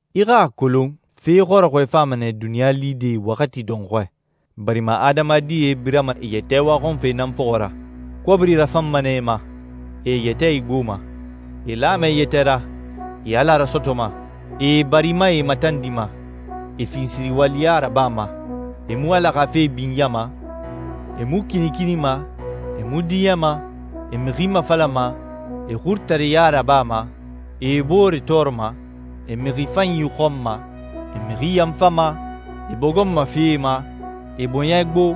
I xa a kolon, fe xɔrɔxɔɛe fama nɛ duniɲa lide waxati dɔnxɔɛ, barima adamadie birama e yɛtɛ waxɔnfe nan fɔxɔ ra, kɔbiri rafanma nɛ e ma, e e yɛtɛ igboma, e lama e yɛtɛ ra, e Ala rasɔtɔma, e e barimae matandima, e finsiriwaliya rabama, e mu Ala xa fe binyama, e mu kinikinima, e mu diɲɛma, e mixi mafalama, e xurutareɲa rabama, e e boore tɔɔrɔma, e mixi fanyi xɔnma, e mixi yanfama, e bogonma fee ma, e bɔɲɛ gbo,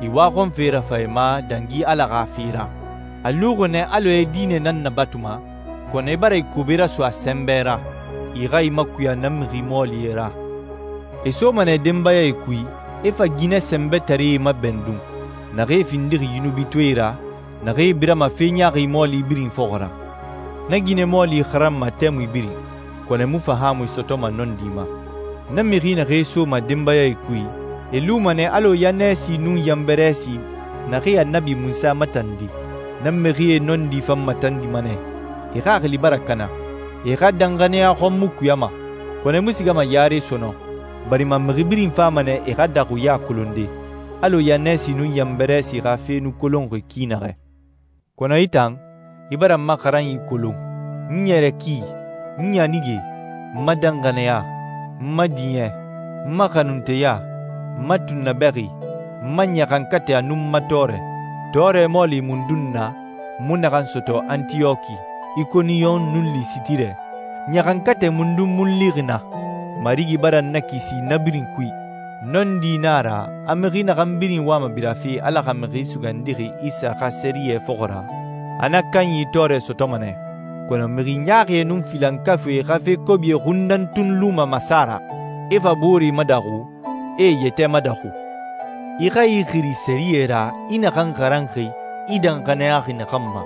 e waxɔnfe rafan e ma dangi Ala xa fe ra. A luxi nɛ alɔ e diinɛ nan nabatuma, kɔnɔ e bara e kobe raso a sɛnbɛ ra. I xa i makuya na mixi mɔɔlie ra. E soma denbayae kui, e fa ginɛ sɛnbɛtaree mabɛndun, naxee findixi yunubitɔɛe ra, naxee birama fe ɲaaxi mɔɔli birin fɔxɔ ra. Na ginɛ mɔɔli xaranma tɛmui birin, kɔnɔ e mu fahaamui sɔtɔma nɔndi ma. Na mixi naxee soma denbayae kui, e luma nɛ alɔ Yannɛsi nun Yanbɛrɛsi naxee Annabi Munsa matandi. Na mixie nɔndi fan matandima nɛ, e xaxili bara kana. E xa danxaniya xɔn mu kuyama. Kɔnɔ e mu sigama yare sɔnɔn, barima mixi birin fama nɛ e xa daxuɲa kolonde, alɔ Yannɛsi nun Yanbɛrɛsi xa fe nu kolonxi ki naxɛ. Kɔnɔ i tan, i bara n ma xaranyi kolon, n ɲɛrɛ ki, n ɲanige, n ma danxaniya, n ma diɲɛ, n ma xanunteya, n ma tunnabɛxi, n ma ɲaxankatɛ, a nun n ma tɔɔrɛ. Tɔɔrɛ mɔɔli mundun na, n mu naxan sɔtɔ Antiyɔki, Ikoniyon, nun Lisitire? Ɲaxankatɛ mundun mu n lixi naa? Marigi bara n nakisi na birin kui. Nɔndi na a ra a mixi naxan birin wama birafe Ala xa Mixi Sugandixi Isa xa sɛriyɛ fɔxɔ ra, a na kanyi tɔɔrɛ sɔtɔma nɛ. Kɔnɔ mixi ɲaaxie nun filankafuie xa fe kobie xun nan tun luma masa ra, e fa booree madaxu, e e yɛtɛ madaxu. I xa i xiri sɛriyɛ ra i naxan xaranxi, i danxaniyaxi naxan ma.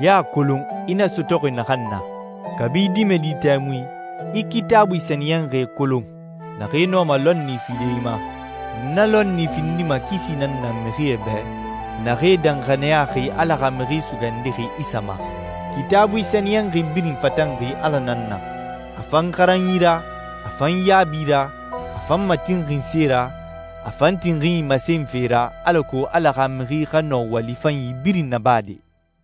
I a kolon i na sɔtɔxi naxan na. Kabi i dimɛdi tɛmui, i Kitaabui sɛniyɛnxie kolon, naxee nɔma lɔnni fide i ma. Na lɔnni findima kisi nan na mixie bɛ, naxee danxaniyaxi Ala xa Mixi Sugandixi Isa ma. Kitaabui sɛniyɛnxi birin fatanxi Ala nan na. A fan xaranyi ra, a fan yaabi ra, a fan matinxinse ra, a fan tinxinyi masenfe ra, alako Ala xa mixi xa nɔ wali fanyi birin nabade.